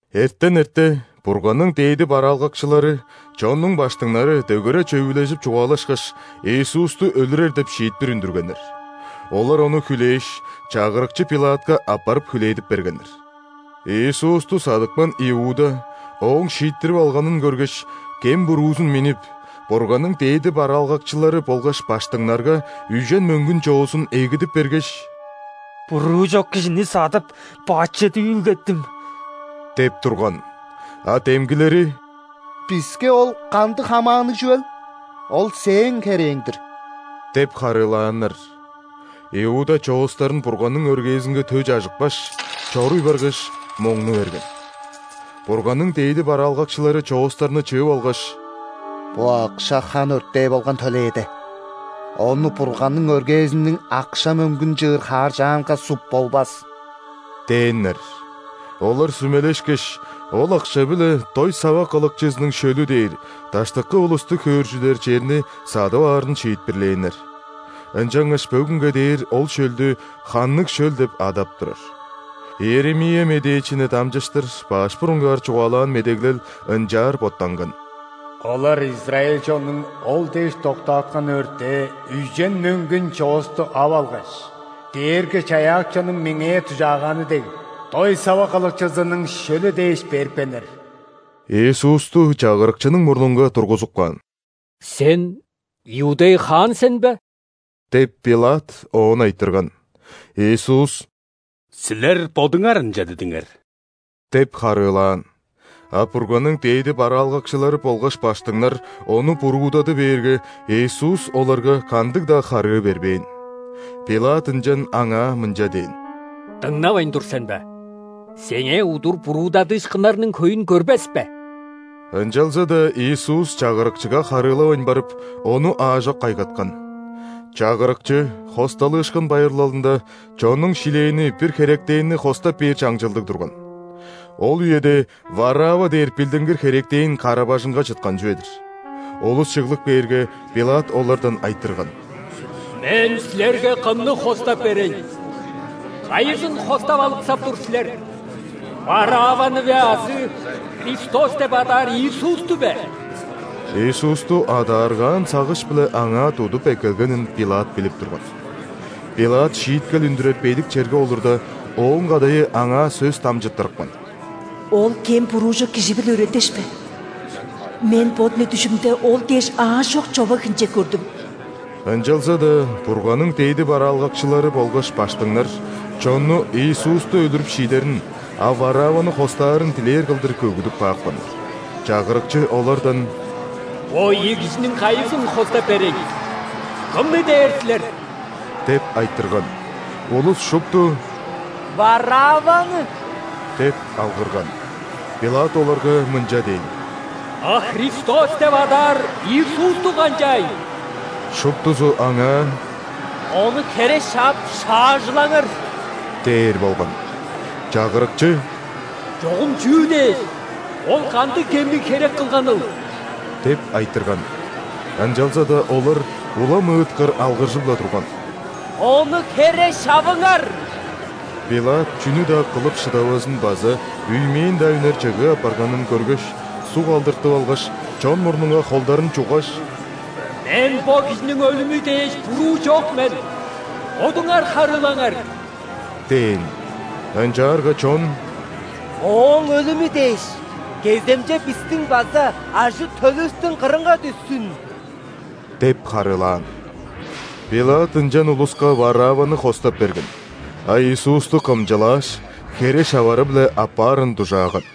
Эртен эрте Бурганның дээди бараалгакчылары, чоннуң ·баштыңнары дөгере чөвүлежип чугаалашкаш, Иисусту өлүрер деп шиитпир үндүргеннер. Олар Ону хүлээш, чагырыкчы ·Пилатка аппарып хүлээдип бергеннер. Иисусту садыпкан Иуда Ооң шииттирип алганын көргеш, кем-буруузун миннип, Бурганның дээди бараалгакчылары болгаш баштыңнарга үжен мөңгүн чоозун эгидип бергеш: «Буруу чок кижини садып, бачыт үүлгеттим» – деп турган. А демгилери: «Биске ол кандыг хамаанныг чүвел? Ол сээң херээң-дир» – деп харыылааннар. Иуда чоостарын Бурганның өргээзинге тө чажыпкаш, чоруй баргаш, моңну берген. Бурганның дээди бараалгакчылары чоостарны чыып алгаш: «Бо акша хан өртээ болган төлээде, ону Бурганның өргээзиниң акша-мөңгүн чыыр хааржаанга суп болбас» – дээннер. Олар сүмелешкеш, ол акша-биле «Дой сава кылыкчызының шөлү» дээр, даштыкы улусту хөөржүдер черни садып аарын шиитпирлээннер. Ынчангаш бөгүнге дээр ол шөлдү «Ханныг шөл» деп адап турар. Иеремия медээчини дамчыштыр баш бурунгаар чугаалаан медеглел ынчаар боттанган:«Олар израиль чоннуң Ол дээш доктааткан өртээ –үжен мөңгүн чоосту ап алгаш, Дээрги-Чаяакчының меңээ дужааганы дег,„Дой сава кылыкчызының шөлү“ дээш берипкеннер». Иисусту чагырыкчының мурнунга тургузуп каан. «Сен – иудей хаан сен бе?» – деп, ·Пилат Оон айтырган. Иисус: «Силер бодуңар ынча дидиңер» – деп харыылаан. А Бурганның дээди бараалгакчылары болгаш ·баштыңнар Ону буруудады бээрге, Иисус оларга кандыг-даа харыы бербээн. Пилат ынчан Аңаа мынча дээн: «Дыңнавайн тур сен бе? Сеңээ удур буруудадыышкыннарның хөйүн көрбес бе?!» Ынчалза-даа Иисус чагырыкчыга харыылавайн барып, ону аажок кайгаткан. Чагырыкчы ·Хосталыышкын байырлалында чоннуң шилээни бир херектенни хостап бээр чаңчылдыг турган. Ол үеде Варавва дээр билдингир херектен кара-бажыңга чыткан чүве-дир. Улус чыглып кээрге, Пилат олардан айтырган: «Мен силерге кымны хостап берейн? Кайызын хостап алыксап тур силер: Варавваны бе азы Христос деп адаар Иисусту бе?» (Иисусту адааргаан сагыш-биле аңаа тудуп эккелгенин Пилат билип турган.) Пилат шииткел үндүрер бедик черге олурда, ооң кадайы аңаа сөс дамчыттырыпкан: «Ол кем-буруу чок кижи-биле үрелдешпе! Мен бо дүне дүжүмде Ол дээш аажок човаг-хинчек көрдүм». Ынчалза-даа Бурганның дээди бараалгакчылары болгаш ·баштыңнар чонну Иисусту өлүрүп шиидерин, а Варавваны хостаарын дилээр кылдыр көгүдүп каапканнар. Чагырыкчы олардан: «Бо ийи кижиниң кайызын хостап берейн, кымны дээр силер?» – деп айтырган. Улус шупту: «Варавваны!» – деп алгырган. Пилат оларга мынча дээн: «А Христос деп адаар Иисусту канчаайн?» Шуптузу аңаа: «Ону хере шаап шаажылаңар!» – дээр болган. Чагырыкчы: «Чогум чүү дээш? Ол кандыг кемниг херек кылганыл?» – деп айтырган. Ынчалза-даа олар улам ыыткыр алгыржып-ла турган: «Ону хере шавыңар!» Пилат чүнү-даа кылып шыдавазын база үймээн-даа үнер чыгыы апарганын көргеш, суг алдыртып алгаш, чон мурнунга холдарын чуггаш: «Мен бо кижиниң өлүмү дээш буруу чок мен, бодуңар харыылаңар» – дээн. Ынчаарга чон: «Ооң өлүмү дээш кеземче бистиң база ажы-төлүвүстүң кырынга дүшсүн» – деп харыылаан. Пилат ынчан улуска Варавваны хостап берген, а Иисусту кымчылааш, хере шавары-биле аппаарын дужааган.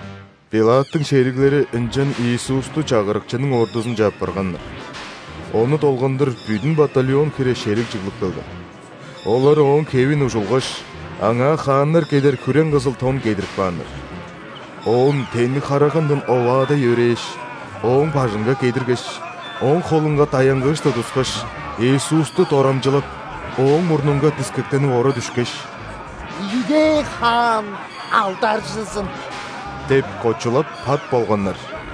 Пилаттың шериглери ынчан Иисусту чагырыкчының ордузунче аппарганнар. Ону долгандыр бүдүн батальон хире шериг чыглып келген. Олар Ооң хевин ужулгаш, Аңаа хааннар кедер хүрең-кызыл тон кедирип кааннар. Оон тенниг харагандан оваадай өрээш, Ооң бажынга кедиргеш, оң холунга даянгыыш тудускаш, Иисусту дорамчылап, Ооң мурнунга дискектенип ора дүшкеш: «Иудей хаан алдаржызын!» – деп кочулап пат болганнар.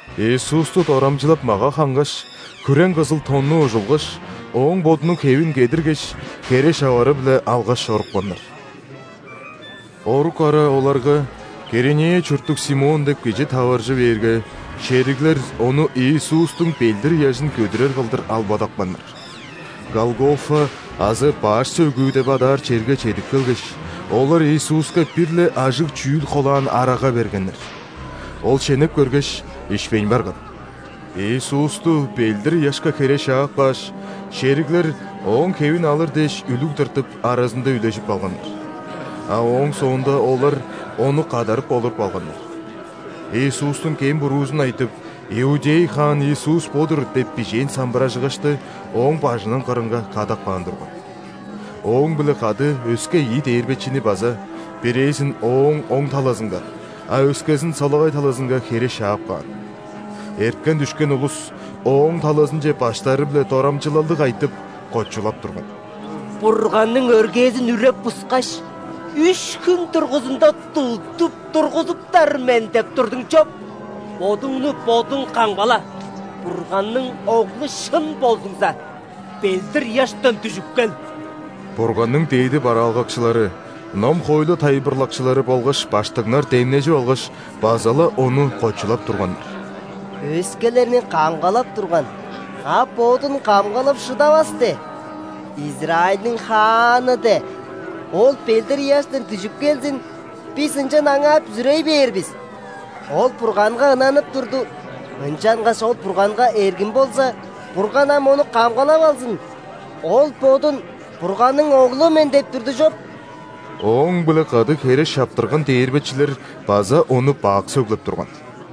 Иисусту дорамчылап мага хангаш, хүрең-кызыл тонну ужулгаш, Ооң Бодунуң хевин кедиргеш, хере шавары-биле алгаш чорупканнар. Орук ара оларга Киринея чурттуг Симон деп кижи таваржы бээрге, шериглер ону Иисустуң ·белдир-ыяжын көдүрер кылдыр албадапканнар. Голгофа азы «Баш сөөгү» деп адаар черге чедип келгеш, олар Иисуска бир-ле ажыг чүүл холаан арага бергеннер. Ол шенеп көргеш, ишпейн барган. Иисусту белдир-ыяшка хере шаап кааш, шериглер Ооң хевин алыр дээш үлүг тыртып, аразында үлежип алганнар. А ооң соонда олар Ону кадарып олуруп алганнар. Иисустуң кем-буруузун айтып: «Иудей хаан Иисус бо-дур» деп бижээн самбыражыгашты Ооң бажының кырынга кадап каан турган. Ооң-биле кады өске ийи дээрбечини база: бирээзин Ооң оң талазынга, а өскезин солагай талазынга хере шаап каан. Эрткен-дүшкен улус Ооң талазынче баштары-биле дорамчылалдыг айтып, кочулап турган: «„Бурганның өргээзин үреп-бускаш, үш хүн дургузунда тудуп тургузуптар мен“ – деп турдуң чоп! Бодуңну Бодуң камгала! Бурганның Оглу шын болзуңза, белдир-ыяштан дүжүп кел!» Бурганның дээди бараалгакчылары, ном-хоойлу тайылбырлакчылары болгаш ·баштыңнар демнежип алгаш, база-ла Ону кочулап турганнар: «Өскелерни камгалап турган, а Бодун камгалап шыдавас де! Израильдиң хааны де! Ол белдир-ыяштан дүжүп келзин, бис ынчан Аңаа бүзүрей бээр бис! Ол Бурганга ынанып турду. Ынчангаш Ол Бурганга эргим болза, Бурган ам Ону камгалап алзын! Ол Бодун Бурганның Оглу мен деп турду чоп!» Ооң-биле кады хере шаптырган дээрбечилер база Ону бак сөглеп турган.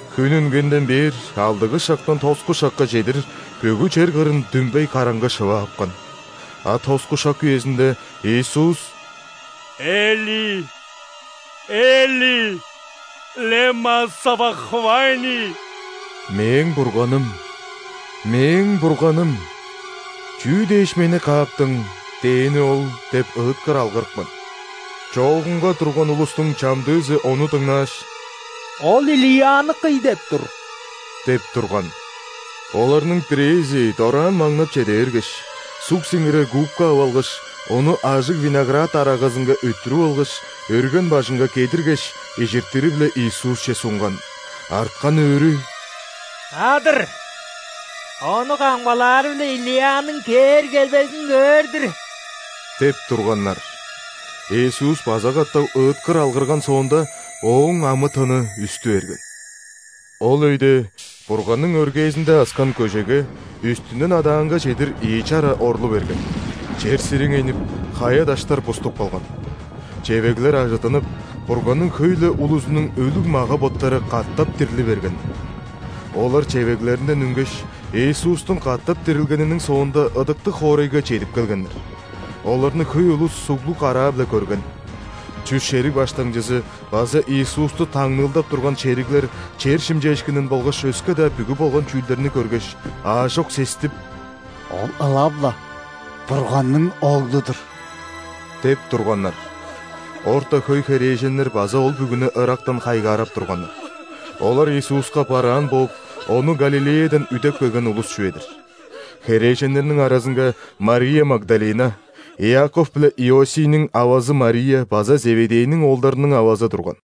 Хүн үнгенден бээр алдыгы шактан тоску шакка чедир бүгү чер кырын дүмбей караңгы шыва апкан. А тоску шак үезинде Иисус: «Эли, Эли, лема савахфани?» («Мээң Бурганым, Мээң Бурганым, чүү дээш Мени кааптың?» – дээни ол.) – деп ыыткыр алгырыпкан. Чоогунга турган улустуң чамдыызы ону дыңнааш: «Ол Илияны кый деп тур» – деп турган. Оларның бирээзи дораан маңнап чеде бергеш, суг сиңирер губка ап алгаш, ону ажыг виноград арагазынга өттүрүп алгаш, өрген бажынга кедиргеш, ижиртири-биле Иисусче сунган. Арткан өөрү: «Адыр! Ону камгалаары-биле Илияның кээр-келбезин көөр-дүр» – деп турганнар. Иисус база катап ыыткыр алгырган соонда, Ооң амы-тыны үстү берген. Ол өйде Бурганның өргээзинде аскан көжеге үстүнден адаанга чедир ийи чара орлу берген. Чер сириңейнип, хая-даштар буступ калган. Чевеглер ажыттынып, Бурганның хөй-ле улузунуң өлүг мага-боттары катап дирли берген. Олар чевеглеринден үнгеш, Иисустуң катап дирилгениниң соонда ыдыктыг хоорайга чедип келгеннер. Оларны хөй улус суглуг караа-биле көрген. Чүс шериг баштыңчызы база Иисусту таңныылдап турган шериглер чер шимчээшкинин болгаш өске-даа бүгү болган чүүлдерни көргеш, аажок сестип: «Ол ылап-ла Бурганның Оглу-дур!» – деп турганнар. Орта хөй херээженнер база ол бүгүнү ырактан хайгаарап турганнар. Олар Иисуска бараан бооп, Ону Галилеядан үдеп келген улус чүве-дир. Херээженнерниң аразынга Мария Магдалина, Иаков биле Иосийниң авазы Мария база Зеведейниң оолдарының авазы турган.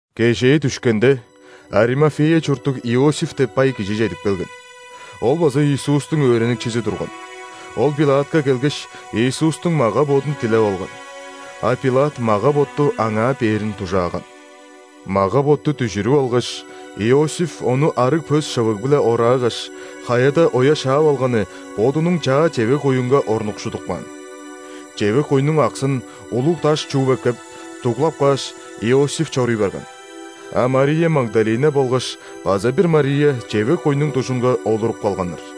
Кежээ дүшкенде, Аримафея чурттуг Иосиф деп бай кижи чедип келген. Ол база Иисустуң өөреникчизи турган. Ол Пилатка келгеш, Иисустуң мага-бодун дилеп алган. А Пилат мага-ботту аңаа бээрин дужааган. Мага-ботту дүжүрүп алгаш, Иосиф ону арыг пөс шывыг-биле ораагаш, хаяда оя шаап алганы бодунуң чаа чевег-куюнга орнукшудуп каан. Чевег-куйнуң аксын, улуг даш чууп эккеп, дуглап кааш, Иосиф чоруй барган. А Мария Магдалина болгаш база бир Мария чевег-куйнуң дужунга олуруп калганнар.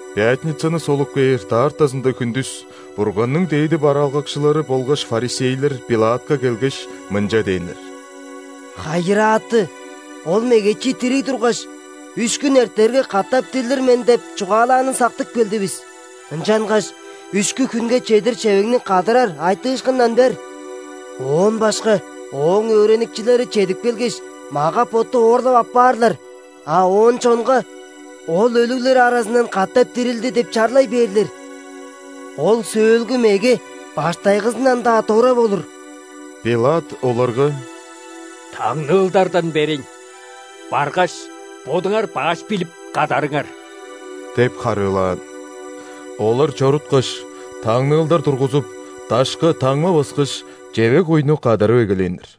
Пятницаны солуп кээр даартазында хүндүс Бурганның дээди бараалгакчылары болгаш ·фарисейлер Пилатка келгеш, мынча дээннер: «Хайырааты! Ол мегечи дириг тургаш: „Үш хүн эртерге, катап дирлир мен“ – деп чугаалаанын сактып келдивис. Ынчангаш үшкү хүнге чедир чевегни кадарар айтыышкындан бер. Оон башка Ооң өөреникчилери чедип келгеш, мага-ботту оорлап аппаарлар, а оон чонга: „Ол өлүглер аразындан катап дирилди“ – деп чарлай бээрлер. Ол сөөлгү меге баштайгызындан-даа дора болур». Пилат оларга: «Таңныылдардан берейн. Баргаш, бодуңар баш билип кадарыңар» – деп харыылаан. Олар чоруткаш, таңныылдар тургузуп, дашка таңма баскаш, чевег-куйну кадарып эгелээннер.